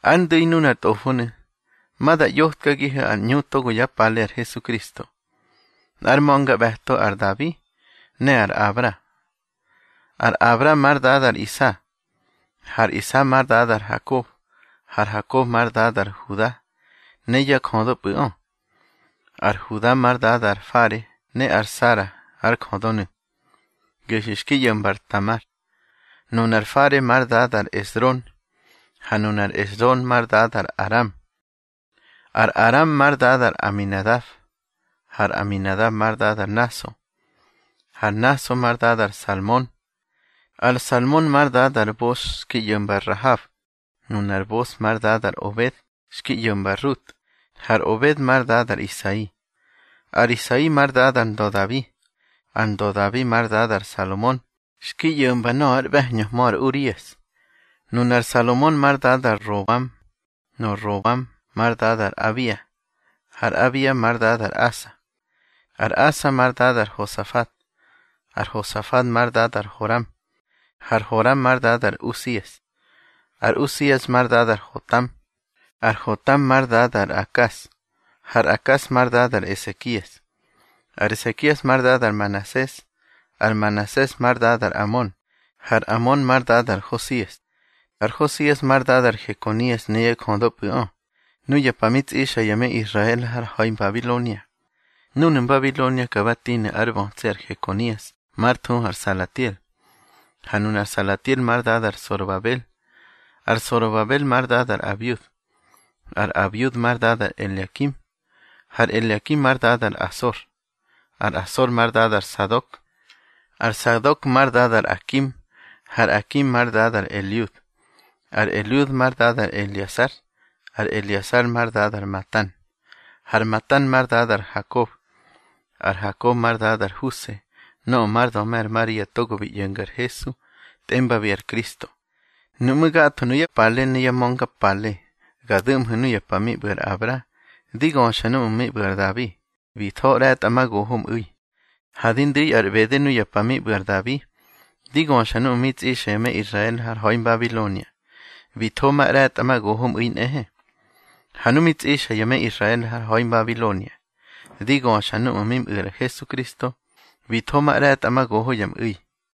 Ár ndu̱i nunar tꞌofonu̱, ma da ꞌyotkagihu̱ ar ꞌñu togo yá pale ar Hesukristo, nꞌár ma̱ngaꞌbe̱to ar Dabi ne ar Abra. Ar Abra már dada ar Isa, har Isa már dada ar Hakob, har Hakob már dada ar Huda ne yá jödöpꞌu̱ꞌö. Ar Huda már dada ar Fare ne ar Zara ár jödönu̱, gehyu̱ xki ꞌyo̱mba ar Tamar. Nunar Fare már dada ar Esrom, ha nunar Esrom már dada ar Aram. Ar Aram már dada ar Aminadab, har Aminadab már dada ar Naso, har Naso már dada ar Salmon. Ar Salmon már dada ar Bos xki ꞌyo̱mba ar Rahab, nunar Bos már dada ar Obed xki ꞌyo̱mba ar Rut, har Obed már dada ar Isai. Ar Isai már dada ar ndö Dabi, ar ndö Dabi már dada ar Salomon xki ꞌyo̱mba nöꞌö ár ꞌbe̱hñöhmö ar Urias. Nunar Salomon már dada ar Roboam, ar Roboam már dada ar Abia, har Abia már dada ar Asa. Ar Asa már dada ar Hosafat, ar Hosafat már dada ar Horam, har Horam már dada ar Usias. Ar Usias már dada ar Hotam, ar Hotam már dada ar Akas, har Akas már dada ar Esekias. Ar Esekias már dada ar Manases, ar Manases már dada ar Amon, har Amon már dada ar Hosias. Ar Hosias már dada ar Hekonias ne yá jödöpꞌu̱ꞌö, nuya pa mi tsꞌixa ya me Israel har ha̱i Mbabilonia. Núnu̱ Mbabilonia ka ba tinu̱ ár bötsi ar Hekonias már thuhu ar Salatiel, ha nunar Salatiel már dada ar Sorobabel. Ar Sorobabel már dada ar Abiud, ar Abiud már dada ar Eleakim, har Eleakim már dada ar Asor. Ar Asor már dada ar Sadok, ar Sadok már dada ar Akim, har Akim már dada ar Eliud. Ar Eliud már dada ar Eleasar, ar Eleasar már dada ar Matan, har Matan már dada ar Hakob. Ar Hakob már dada ar Huse nöꞌö már döme ar Maria togo bi ꞌyo̱nga ar Hesu tꞌembabi ar Kristo. Nuꞌmú̱, gatho nuyá pale ne yá ma̱ngapale, ga du̱ꞌmhu̱ nuya pa mi ꞌbu̱ ar Abra, di göxa núꞌmu̱ mi ꞌbu̱ ar Dabi, bi tho ꞌre̱tꞌamagoho mꞌu̱i. Ha di ndu̱i ar ꞌbede nuya pa mi ꞌbu̱ ar Dabi, di göxa núꞌmu̱ mi tsꞌixa ya me Israel har ha̱i Mbabilonia, bi tho ma ꞌre̱tꞌamagoho mꞌu̱i nꞌehe. Ha nu mi tsꞌixa ya me Israel har ha̱i Mbabilonia, di göxa núꞌmu̱ mi mꞌu̱ ar Hesukristo, bi tho ma ꞌre̱tꞌamagoho ya mꞌu̱i.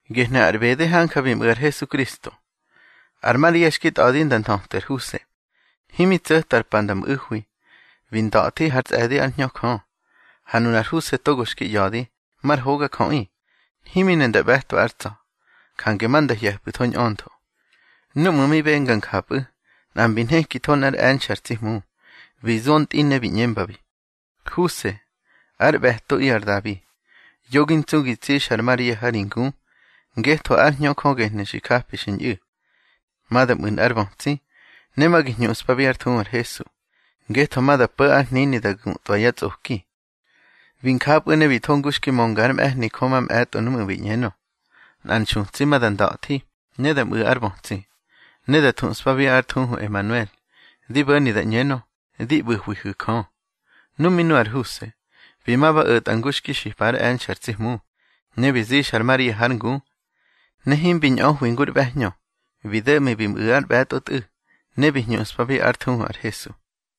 Gehnu̱ ar ꞌbede hanja bi mꞌu̱ ar Hesukristo. Ar Maria xki tꞌa̱di nda nthötwi ar Huse. Himi tso̱ta ar pa nda mꞌu̱hwi, bi nda̱thi hár tsꞌe̱di ár Hñö Jö. Ha nunar Huse togo xki ꞌya̱di, mar hogajöꞌi; himi ne nda ꞌbe̱twa ár tsa̱, jange ma nda hye̱pꞌu̱tho ñꞌöntho. Núꞌmu̱ mi benga njapꞌu̱, nꞌa mbi nhekitho nꞌár e̱nxe̱ ar tsi Hmu, bi zo ntꞌi ne bi ꞌñembabi: —Huse, ár ꞌbe̱toꞌi ar Dabi, yo gi ntsu gi tsixa ar Maria ha ri ngu, ngetho ár Hñö Jö gehnu̱ xi japi xi ñꞌu̱. Ma da mꞌu̱ nꞌár bötsi, ne ma gi hñuꞌspabi ár thuhu ar Hesu, ngetho ma da po̱ ár hnini da gutwa yá tsꞌoki. Bi njapꞌu̱ ne bi tho ngu xki mönga ár mꞌe̱hni Jö mamꞌe̱tꞌo núꞌmu̱ bi ꞌñenö: Nꞌar nxutsi ma da nda̱thi ne da mꞌu̱ ár bötsi, ne da thuꞌspabi ár thuhu Emanuel, di bo̱ni da ꞌñenö: Di ꞌbu̱hwihu̱ Jö. Nu mi nu ar Huse, bi ma ba o̱tꞌa ngu xki xipa ár e̱nxe̱ ar tsi Hmu, ne bi zixa ar Maria hár ngu. Ne himbi ñꞌöhwi ngur ꞌbe̱hñö, bi do̱ꞌmi bi mꞌu̱ ár ꞌbe̱tꞌo tꞌu̱, ne bi hñuꞌspabi ár thuhu ar HESU.